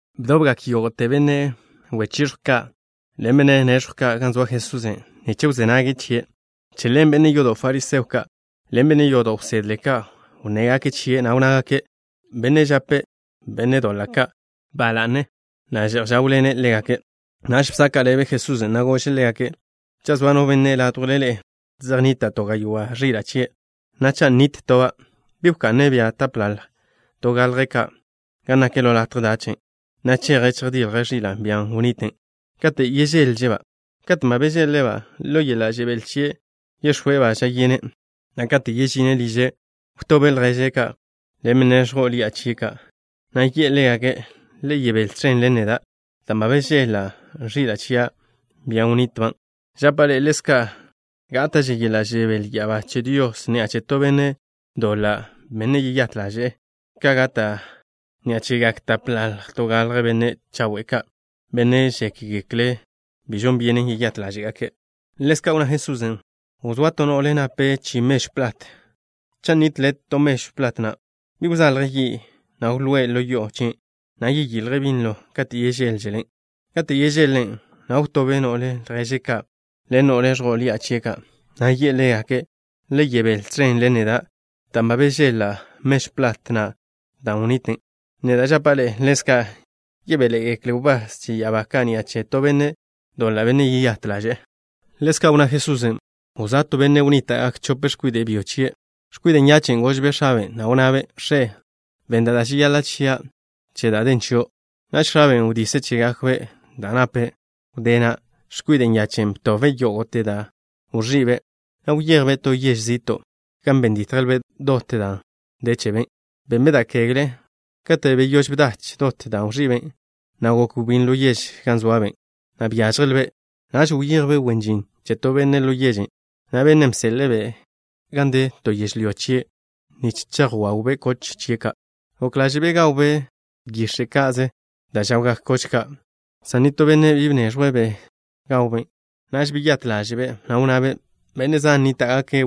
Bdobgak yógo'te benne' wechiẕjw ka' ḻen benne' nex̱jw ka' gan zoa Jesusen', nich wzé nággake' chie'. Che ḻen benne' yodo' fariseo ka' ḻen benne' yodo' wsedle ka' wnnégake' chie', na' wnnágake': —Bennen' žape' benne' doḻa' ka' ba la'ne, na' že'j žáwḻene' ḻégake'. Naž bsaka' ḻebe Jesusen', na' gože' ḻégake': —Cha' zoa no benne' ládjwle ḻe'e, zej nnita' to gaywá' ẕila' chie', na' cha' nitlba' toba', ¿bi wka'ne' bia tapḻalj to galje ka' gan nak ḻo latje dachen', na' cheje' chejdilje' ẕilan', bia nnitlba', kate' yežéḻžele'-ba'? Katen' ba bežeḻ-le'-ba', ḻo yeḻa' žebél chie' yex̱óe'-ba' ža'a yene', na' kate' yežine' liže', wtobe' lježe' ka' ḻen benne' ẕjo'o ḻi'a chie' ka', na' yi'e ḻégake': “Le yebél tẕen ḻen neda', dan' ba bežeḻ-la' ẕila' chia', bian' wnitlba'.” Žapa' ḻe'e: ḻezka' gáta'že yeḻa' žebél ya'abá che Dios ni'a che to benne' doḻa', benne' yeyát ḻaže'e, ka gata' ni'a chegak tapḻalj to galje benne' chawe' ka', benne' žékgekle' bi žon byenen yeyát ḻáže'gake'. Ḻezka' wnná Jesusen': —Wzóa to no'le nape' chi mežw plat. Cha' nitle to mežw plat na', ¿bi wzalje' yi', na' wlóe' ḻo yo'o chien', na' yeyiljen' binlo kate' yežéḻželen'? Katen' yežeḻ-len', na' wtobe' no'le lježe' ka' ḻen no'le ẕjo'o ḻi'a chie' ka', na' yi'e ḻégake': “Le yebél tẕen ḻen neda', dan' ba bežeḻ-la' mežw plat na' dan' wnitlen.” Neda' žapa' ḻe'e: ḻezka' yebéḻe'egekle wbás che ya'abá ka' ni'a che to benne' doḻa', benne' yeyát ḻaže'e. Ḻezka' wnná Jesusen': —Wzóa to benne' wnníta'gak chope x̱kwide' byo chie'. X̱kwide' nyache' gožbe' x̱abe', na' wnnabe': “X̱e, benn da' žeyaḻa' chia' che da' den chio'.” Naž x̱aben' wdise' chégakbe' da' nape'. Wdé na', x̱kwide' nyachen' btobbe' yógo'te da' wẕi'be', na' wyejbe' to yež zi'to', gan ben ditjlbe' dot da' den chebe'. Benbe' da' kegle. Katen' beyóž bdach dot dan' wẕi'be', na' gok wbín ḻo yež gan zoabe', na' byážjelbe'. Naž wyejbe' wen žin che to benne' ḻo yežen', na' bennen' bseḻe'e-be' gan de to yežlyó chie' nich chejwawbe' koch chie' ka'. Gok ḻáže'be' gawbe' yix̱e' ka'ze da' žawgak koch ka', san nitó benne' bi be bneẕjwen' gawbe'. Naž beyát ḻáže'be', na' wnnabe': “Benne' zan nníta'gake'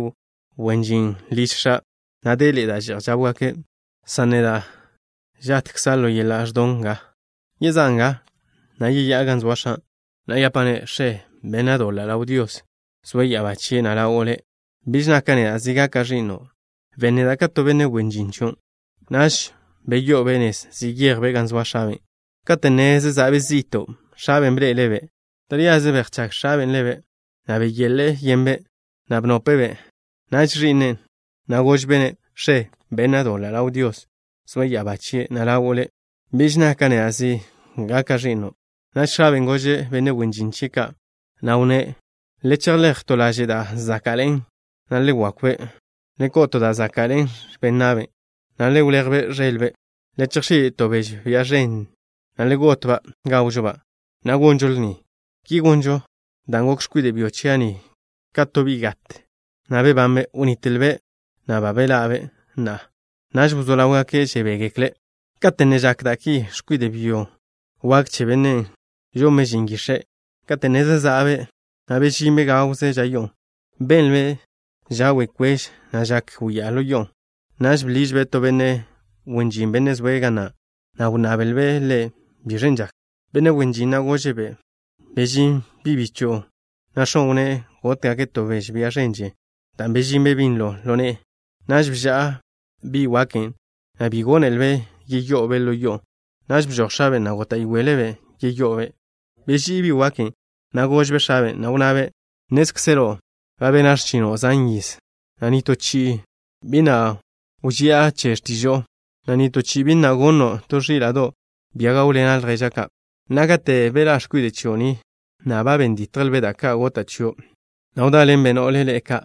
wen žin liž x̱a', na' deḻe'e da' že'j žáwgake', san neda' žatkza' ḻo yeḻa' ẕdon nga. Yezá'a nga, na' yeyá'a gan zoa x̱a', na' yapa'-ne': X̱e, bena' doḻa' ḻaw Dios, zoe' ya'abá chie', na' ḻawo' le'. Biž naka' neda' zi gaka' ẕi'no'. Ben neda' ka to benne' wen žin chio'.” Naž beyo'obe' nez, zeyejbe' gan zoa x̱abe'. ’Kate' ne zeza'be' zi'to', x̱abe' bḻe'ele'-be', na' beyache' ḻáže'le'-be'. Taríaze bejchág x̱abe' ḻebe', na' beyeḻe'e yenbe', na' bnope'e-be'. Naž ẕi'ne' na' gožbe'-ne': “X̱e, bena' doḻa' ḻaw Dios, zoe' ya'abá chie', na' ḻawo' le'. Biž naka' neda' zi gaka' ẕi'no'.” Naž x̱abe' gože' benne' wen žin chie' ka', na' wnné': “Le chejléj to laže' da' záka'ḻe'en, na' le wakw-be'. Le ko'o to da' záka'ḻe'e x̱ben na'be', na' le wléj-be' ẕelbe'. Le chejx̱í' to beže, bia ženne', na' le got-ba'. Gawžo-ba', na' gonžo lni. Ki gonžo dan' gok x̱kwide' byo chia' ni ka to bi' gat, na' bebanbe'. Wnitlbe', na' ba beḻa'be' na'a.” Naž wzó ḻáwgake' žebégekle'. ’Kate' ne žak da' ki, x̱kwide' byo wak che bennen' žonbe' žin yix̱e'. Kate' ne zeza'be', na' bežinbe' gawze ža yo'o, benlbe' ža' we' kwež, na' žak wyá'a ḻo yo'on'. Naž bḻižbe' to benne' wen žin, benne' zoe' ga na', na' wnnablbe' ḻe' biẕen' žaken. Benne' wen žin na' gože'-be': “Bežín bi' bicho'on', na' x̱o' wnné' gótgake' to beže, bia ženne', dan' bežinbe' binlo ḻo ne'e.” Naž bža'a bi' waken', na' bi gónelebe' yeyo'obe' ḻo yo'on'. Naž bežój x̱aben', na' góta'yoele'-be' yeyo'obe'. Beží'i bi' waken', na' gožbe' x̱abe', na' wnnabe': “Nnézkzelo' ba bena' x̱chino' zan yiz, na' nitó chi'i bi na' wži'a che x̱tižo'o, na' nitó chi'i bi na' gonno' to ẕíla'do', bia gáwḻena' lježa' ka'. Na'a, kate' beḻá' x̱kwide' chio' ni, na' ben ditjlbe' da' ka' gota' chio', na' wdáḻenbe' no'le ḻe'e ka',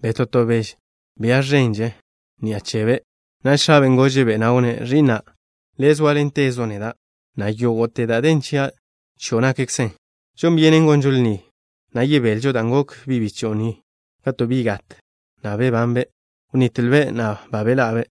beto' to beže, bia ženne', ni'a chebe'.” Naž x̱abe' gože'-be', na' wnné': “Ẕi'na', le' zóaḻentezo' neda', na' yógo'te da' den chia', chio' nakkzen. Žon byenen gonžo lni, na' yebelžo, dan' gok bi' bicho'o ni ka to bi' gat, na' bebanbe'. Wnitlbe', na' ba beḻa'be'.”